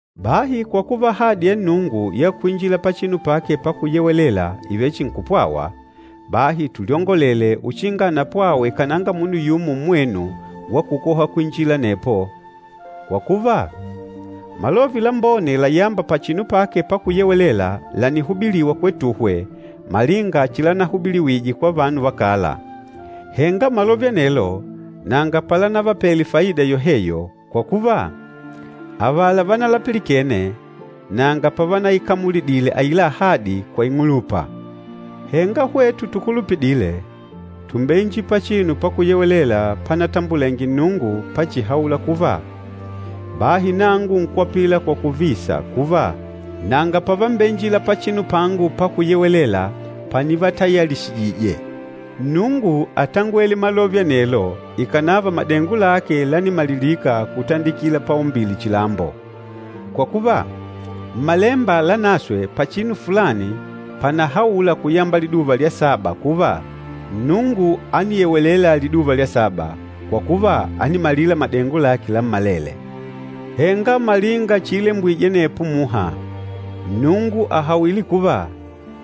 Bahi kwa kuva ahadi ya Nnungu ya kwinjila pachinu pake pakuyewelela ìvele chihi nkupwawa, bahi tulyongolele uchinga anapwawe kananga munu yumo mmwenu wa kukoha kwinjila anepo. Kwa kuva, malove lambone layâmba pachinu pake pakuyewelela lànihubiliwa kwetuhwe malinga chilanahubiliwije kwa vanu va kala. Henga malove anelo nanga palanavapele faida yoheyo, kwa kuva, avala vanalapilikene nanga pavanaikamulidile aila ahadi kwa ing'ulupa. Henga hwetu tukulupidîle, tùmbeinjila pachinu pakuyewelela panatambulenge Nnungu pachihaula kuva, “Bahi nangu nkwapila kwa kuvisa kuva, ‘Nanga pavambeinjila pachinu pangu pakuyewelela panivatayalishijije.’” Nnungu átangwele malove anelo ikànava madengo lake lánimalilika kutandikila paumbile chilambo. Kwa kuva, Mmalemba Lanaswe pachinu fulani pànahaula kuyamba liduva lya saba kuva, “Nnungu ániyewelela liduva lya saba, kwa kuva ánimalila madengo lake lammalele.” Henga malinga chiilembwije anepo muha, Nnungu àhawile kuva,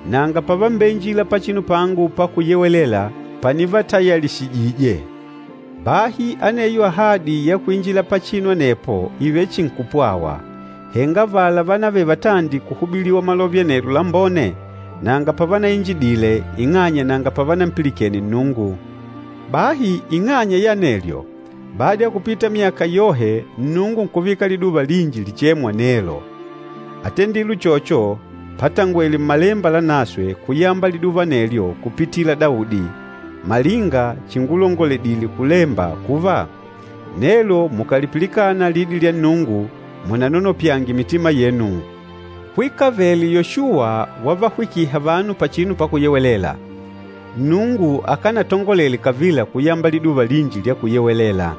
“Nanga pavambeinjila pachinu pangu pakuyewelela panivatayalishijije.” Bahi aneyo ahadi ya kuinjila pachinu anepo ìvele chihi nkupwawa, henga avala vánavele vatandi kuhubiliwa malove anelo lambone nanga pavanainjidile ing'anya nanga pavanampilikene Nnungu. Bahi ing'anya ya anelyo, bada ya kupita myaka yohe Nnungu nkuvika liduva linji lichêmwa “Nelo.” Átendile uchocho patangwele Mmalemba Lanaswe kuyamba liduva anelyo kupitila Daudi, malinga chingulongoledile kulemba kuva, “Nelo mukàlipilikana lidi lya Nnungu, munanonopyange mitima yenu.” Kwikavele Yoshuwa wavahwikiha vanu pachinu pakuyewelela, Nnungu akánatangolele kavila kuyamba liduva linji lya kuyewelela.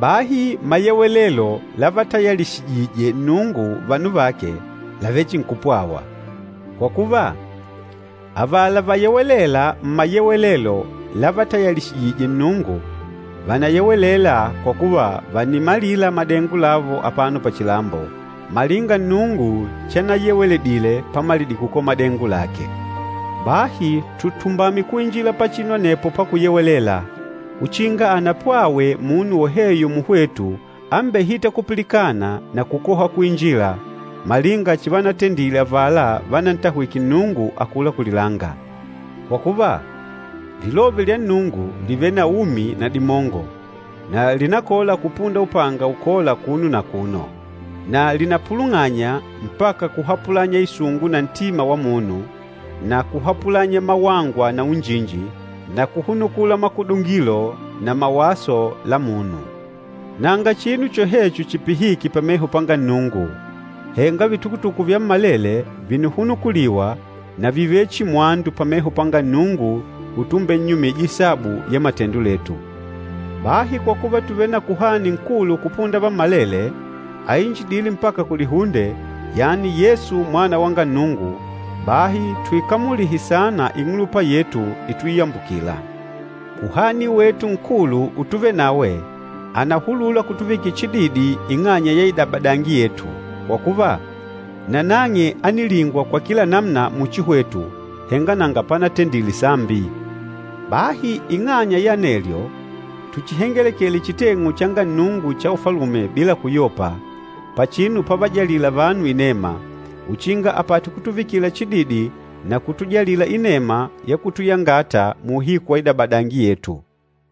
Bahi mayewelelo lavatayalishijîje Nnungu vanu vake làvele chihi nkupwawa. Kwa kuva, avala vayewelêla mmayewelelo lavatayalishijîje Nnungu, vànayewelela kwa kuva vànimalila madengo lavo apano pachilambo, malinga Nnungu chanayeweledile pamalidile kukola madengo lake. Bahi tutumbame kuinjila pachinu anepo pakuyewelela, uchinga anapwawe munu woheyo muhwetu ambehîta kupilikana na kukoha kuinjila, malinga chivanatendile avala vanantahwike Nnungu akula kulilanga. Kwa kuva, Lilove lya Nnungu lìvele na umi na dimongo, na lìnakola kupunda upanga ukola akuno na akuno. Na lìnapulung'anya mpaka kuhapulanya isungu na ntima wa munu, na kuhapulanya mawangwa na unjinji, na kuhunukula makudungilo na mawaso la munu. Nanga chinu chohecho chipihîke pameho panga Nnungu, henga vitukutuku vyammalele vìnihunukuliwa na vìvele chihi mwandu pameho panga Nnungu utumbennyumija isabu ya matendo letu. Bahi kwa kuva tùvele na Kuhani Nkulu kupunda vammalele, ainjidîle mpaka kulihunde, yani Yesu Mwana wanga Nnungu, bahi tuikamulihe saana ing'ulupa yetu ituiyambukila. Kuhani wetu Nkulu utuvenawe ànahulula kutuvikila chididi ing'anya ya idabadangi yetu. Kwa kuva, nanang'e ánilingwa kwa kila namuna muchi hwetu, henga nanga panatendile sambi. Bahi ing'anya ya anelyo, tuchihengelekele chiteng'u changa Nnungu cha Ufalume bila kuyopa, pachinu pavajalîla vanu inema, uchinga apate kutuvikila chididi na kutujalila inema ya kutuyangata muuhiku wa idabadangi yetu.